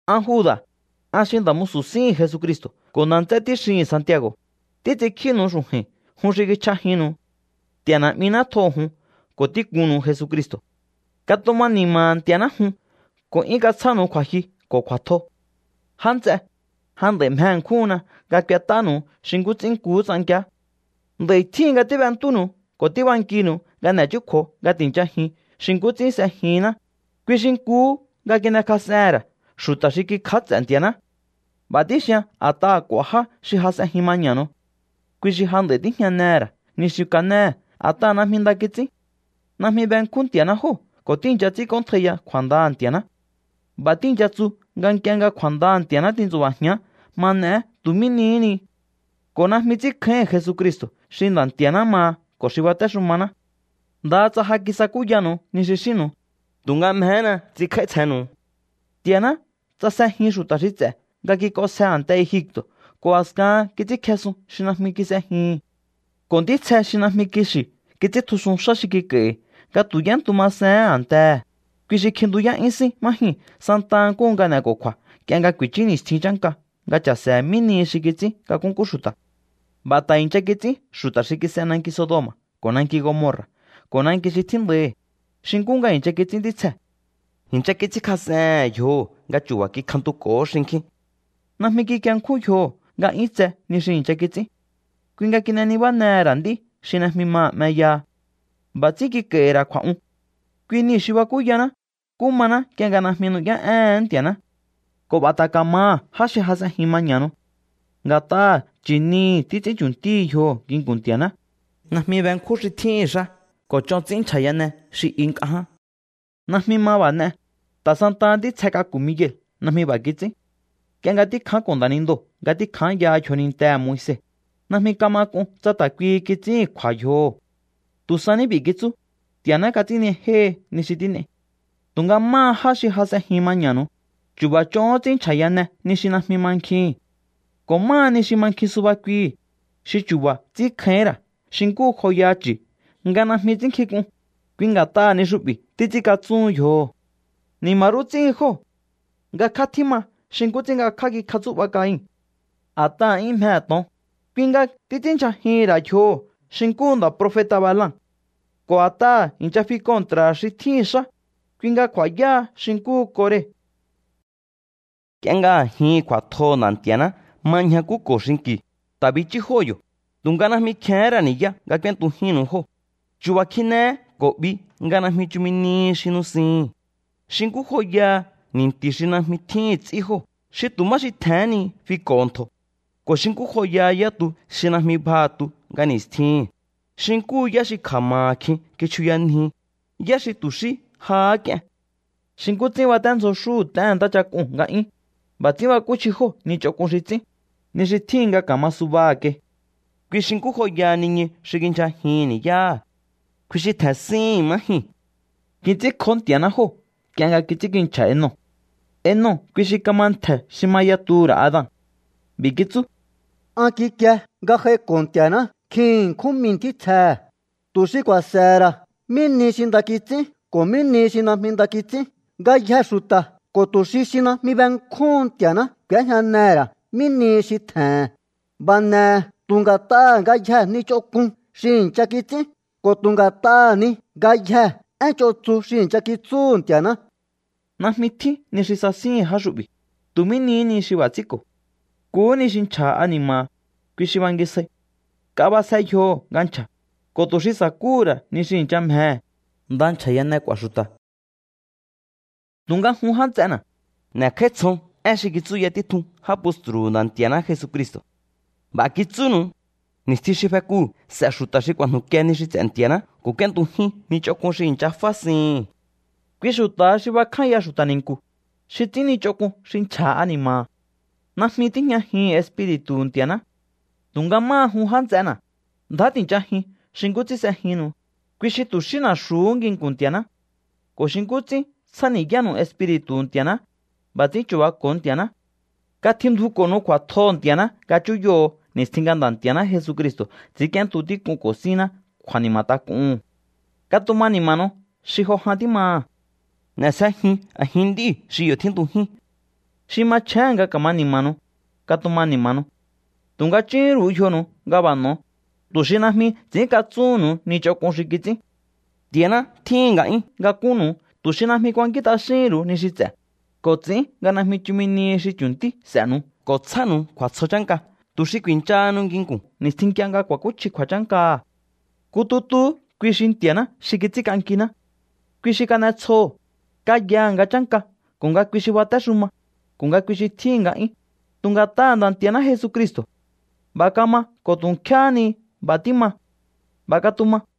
An Juda̱, an xi nda̱ musu̱ síhi̱n Jesucristo̱ ko̱ nda̱ nts'é tíxihi̱n Santiago̱, títs'inkjínu̱u xu̱ju̱i̱n jun xi kichj'ajinnu̱u. Nti̱a̱ Na̱'miná tjoho̱ jun ko̱ tíkunnu̱u Jesucristo̱. Katuma ni̱ma̱ha̱ Nti̱a̱ná jun ko̱ 'yún katsjánu̱u kju̱a̱jyu ko̱ kju̱a̱tjo. Já nts'e, ja nd'a̱i mje ṉkjúhunna nga k'uet'ánu̱u xi nkú ts'ín nkuhú ts'ankiá. Nd'a̱i̱ tjíhin nga tíb'entúnu̱u ko̱ tíbankinu̱u nga n'e̱ chúkju̱o̱ nga ti̱nchajiun xi nkú ts'ín s'ejinná, kui xi nkuhú nga kin'ekjas'ehe̱n ra̱ xu̱ta̱ xi kikj'áts'e̱ Nti̱a̱ná. B'a̱ tíxian a̱t'aha̱ k'u̱a̱ já xi jas'enjin maña̱nu̱u. Kui xi ja nd'a̱i tíjñanehe̱ ra̱ ni xi kanéhe̱ a̱t'aha̱ najmi nda kits'ín. Najmi benkjún Nti̱a̱ná jóo̱ ko̱ tíi̱ncha ts'ínkj'óntjaiya kju̱a̱ndaha̱ Nti̱a̱ná. B'a̱ tíi̱ncha tsu nga nk'ie nga kju̱a̱ndaha̱ Nti̱a̱ná tintsu̱ba̱jián ma n'eé tu̱ mí nihí ni. Ko̱ najmi ts'ínkjáíhi̱n Jesucristo̱ xi Nda̱ Nti̱a̱ná maha ko̱ xi batéxumaná. Ndaha tsa ja kisakúyanu̱u ni xi xínnu̱u, tu̱nga mjehéna ts'inkj'áítsjennu̱u. Nti̱a̱ná ts'asjejin xu̱ta̱ xi ts'e̱ nga kik'onsje a̱nte Egipto̱ ko̱ a̱skahan kits'ínkjesun xi najmi kis'ejihi̱n. Ko̱ ntítsje xi najmi kixi̱ kits'íntjusun xá xi kik'a̱i̱hi̱ nga tu̱ y'éntu masehén a̱ntehe̱, kui xi kjintuyá'yún sín má jyuu̱n santa nkúhu nga n'e̱ko̱ku̱a̱ nk'ie nga ku̱i̱chú ni̱stjin chánka nga cha̱se̱he̱ mí nihi xi kits'ín nga nkúnkú xu̱ta̱. B'a̱ ta̱ i̱ncha kits'ín xu̱ta̱ xi kis'e nanki Sodoma̱ ko̱ nanki Gomorra̱ ko̱ nanki xi tjíndaihi̱, xi nkú nga i̱ncha kits'ín ntítsjee̱. I̱ncha kits'ínkas'ehe̱n yjoho̱ nga chu̱ba̱ kikjantuko̱hó xinkjín. Najmi kikienkjún yjoho̱ nga 'yún tse ni xi i̱ncha kits'ín. Kui nga kin'e nibájenehe̱n ra̱ nd'í xi najmi maha̱ 'meyaha. B'a̱ ts'ín kik'a̱i̱hi̱ ra̱ kju̱a̱'un. Kui niu̱ xi bakúyaná nkú maná nk'ie nga najmi nu'yá'éhe̱én Nti̱a̱ná. Ko̱ b'a̱ ta̱ ka̱maha̱ já xi jas'ejín maña̱nu̱u. Nga̱t'aha̱ nchi̱nihi̱ títs'ín chu̱ntíhi yjoho̱ nginku̱n Nti̱a̱ná, najmi benkjún xi tjíhi̱n xá ko̱ ch'on ts'ín nchja̱yane xi i nk'a ján. Najmi ma b'a̱ n'e, ta̱ santaha ntítsje k'aku̱ Miguel najmi b'a̱ kits'ín. Nk'ie nga tíkjánko̱ nda̱nindoo̱ nga tíkjányaha yjonintehe̱ Moise, najmi kama k'un tsa ta̱ kuihi kits'íhi̱n kju̱a̱ yjoho̱. Tu̱ sa ní b'i̱ kitsú: “¡Nti̱a̱ná kats'ínnijéhi ni xi tín'ei!” Tu̱nga máha já xi jas'ejin maña̱nu̱u, chu̱ba̱ ch'ohón ts'ín nchja̱yane ni xi najmi mankjihi̱n. Ko̱ máha ni xi mankjin suba kuihi̱, xi chu̱ba̱ ts'ínkjáíhín ra̱ xi nkú joyaha chu̱ nga najmi ts'ínnkjink'un, kui nga̱t'aha̱ ni xu'bi̱ títs'ínkatsúhun yjoho̱. ¡Ni̱ma̱ rú ts'íhin jóo̱! Ngakjá tjíma xi nkú ts'ín ngakjá kikjatsú'ba Cain. A̱t'aha̱ 'yún mjehe̱ to̱on, kui nga títs'ínndyjajihi̱n ra̱ yjoho̱ xi nkúhu nda̱ profeta̱ Balaam. Ko̱ a̱t'aha̱ i̱ncha fi kontraha̱ xi tjíhi̱n xá, kui nga ku̱a̱yáha xi nkúhu Kore. Nk'ie nga a̱jihi̱n kju̱a̱tjoho̱ Nda̱ Nti̱a̱ná ma ñjakúko̱ xinki̱u, ta̱ bichú jóo̱ yo̱, tu̱nga najmi kjehén ra̱ ni̱yá nga k'úéntujínnu̱u jóo̱. Chu̱ba̱ kjinehé ko̱ 'bi nga najmi chumi nihi xi nusihi̱n. Xi nkú joyaha ni̱nti̱ xi najmi tjíhi̱n ts'í jóo̱, xi tu̱ má xi tje̱hén ni fiko̱ho̱ ntjo̱. Ko̱ xi nkú joyaha yá tu xi najmi bjaha̱ tu nga ni̱stjihi̱n, xi nkúhu yá xi kja̱ma̱ha̱ kjin kichjuyanji, yá xi tu̱ xí jahá k'ien. Xi nkú ts'ín baténdzjo xúhu̱ t'éhe̱n ntáchak'uu̱n nga 'yún, b'a̱ ts'ín bakúchji jóo̱ ni ch'onk'un xi ts'ín, ni xi tjíhin nga ka̱ma subaha̱ kai. Kui xi nkú joyaha niñu xi kindyjajihi̱n ni̱yáha̱. Kui xi tje̱n síhi̱n má jyuu̱n. Kits'ínkjó Nti̱a̱ná jóo̱ nk'ie nga kits'ínkinchja̱ Enoc. Enoc kui xi kama ntje̱ xi ma yatuhu̱ ra̱ Adan. B'i̱ kitsú: “An kikie nga j'aiko̱ Nti̱a̱ná nkjin ṉkjún mii̱ ntítsjehe̱, tu̱ xi ku̱a̱se̱he̱ ra̱ mí ni xi nda kits'ín ko̱ mí ni xi najmi nda kits'ín ngayjee̱ xu̱ta̱ ko̱ tu̱ xi xi najmi benkjúhun Nti̱a̱ná k'u̱éjñanehe̱ ra̱ mí nihi xi tje̱he̱n. B'a̱ n'e̱he̱ tu̱ nga̱t'aha̱ ngayjee̱ ni ch'onk'un xi i̱ncha kits'ín ko̱ tu̱ nga̱t'aha̱ ni ngayjee̱ én ch'on tsu xi i̱ncha kitsúhu̱ Nti̱a̱ná.” Najmi tjín ni xi sasíhi̱n já xu'bi̱. Tu̱ mí nihí ni xi b'a̱ ts'ínko̱. Nkuhú ni xi nchja̱ha̱ ani̱ma̱ha̱, kui xi bangisjai. Nk'a b'asje yjoho̱ nga nchja̱, ko̱ tu̱ xi sa̱kúhu̱ ra̱ ni xi i̱ncha mjehe̱, nda nchja̱yane k'u̱a̱ xu̱ta̱. Tu̱nga jun já nts'ena̱, n'e̱kj'áítsjon én xi kitsúya títjun já postru̱hu̱ Nda̱ Nti̱a̱ná Jesucristo̱. B'a̱ kitsúnu̱u: “Ni̱stjin xi fekuu̱ s'e̱ xu̱ta̱ xi ku̱a̱jnu̱kie ni xi ts'e̱ Nti̱a̱ná ko̱ k'úéntujín ni ch'onk'un xi i̱ncha fásihi̱n.” Kui xu̱ta̱ha xi bakjánya xu̱ta̱ ni̱nku̱, xi ts'ín ni ch'onk'un xi nchja̱ha̱ ani̱ma̱ha̱. Najmi tíjñajihi̱n Espiri̱tu̱hu̱ Nti̱a̱ná. Tu̱nga máha jun, já nts'ena̱, ndjá ti̱nchajiun xi nkú ts'ín s'ejinnu̱u, kui xi tu̱ xí na̱xu̱hú nginku̱n Nti̱a̱ná. Ko̱ xi nkú ts'ín tsjáni̱yánu̱u Espiri̱tu̱hu̱ Nti̱a̱ná, b'a̱ ts'ín chu̱bako̱o Nti̱a̱ná. Katjindjuko̱nu̱u kju̱a̱tjoho̱ Nti̱a̱ná nga chúyoho̱o ni̱stjin nga Nda̱ Nti̱a̱ná Jesucristo̱ ts'i̱ínk'íéntu tík'unko̱ sínná kju̱a̱ni̱ma̱ tak'uhu̱n. Katuma ni̱ma̱nu̱u xi jo jan tímaha̱. N'e̱sjejiun a̱jin nd'íu̱ xi yo̱ tjíntujín. Xi machjéhe̱n nga ka̱ma ni̱ma̱nu̱u, katuma ni̱ma̱nu̱u. Tu̱nga chúhún ru̱u yjonu̱u nga b'a̱ n'o̱, tu̱ xi najmi ts'i̱ínkatsúhu̱nnu̱u ni ch'onk'un xi kits'ín. Nti̱a̱ná tjíhi̱n nga'yún nga kúnnu̱u tu̱ xi najmi kuankín t'axíhi̱n ru̱u ni xi ts'e̱, ko̱ ts'i̱ín nga najmi chumi nihi xi chju̱ntí s'e̱nu̱u ko̱ tsjánu̱u kju̱a̱tsjo chánka tu̱ xi ku̱i̱nchahanu nginku̱n ni̱stjin nk'ie nga kua̱kúchji kju̱a̱chánkaha̱. Nku tutuhú kui xi Nti̱a̱ná xi ts'ínk'ankiná. Kui xi kan'etsjoho̱, kayaha̱ nga chánka ko̱ nga kui xi batéxuma, ko̱ nga kui xi tjíhi̱n nga'yún, tu̱ nga̱t'aha̱ Nda̱ Nti̱a̱ná Jesucristo̱. B'a̱ kama ko̱ tu nkjéhé ni nga b'a̱ tíma. B'a̱ katuma.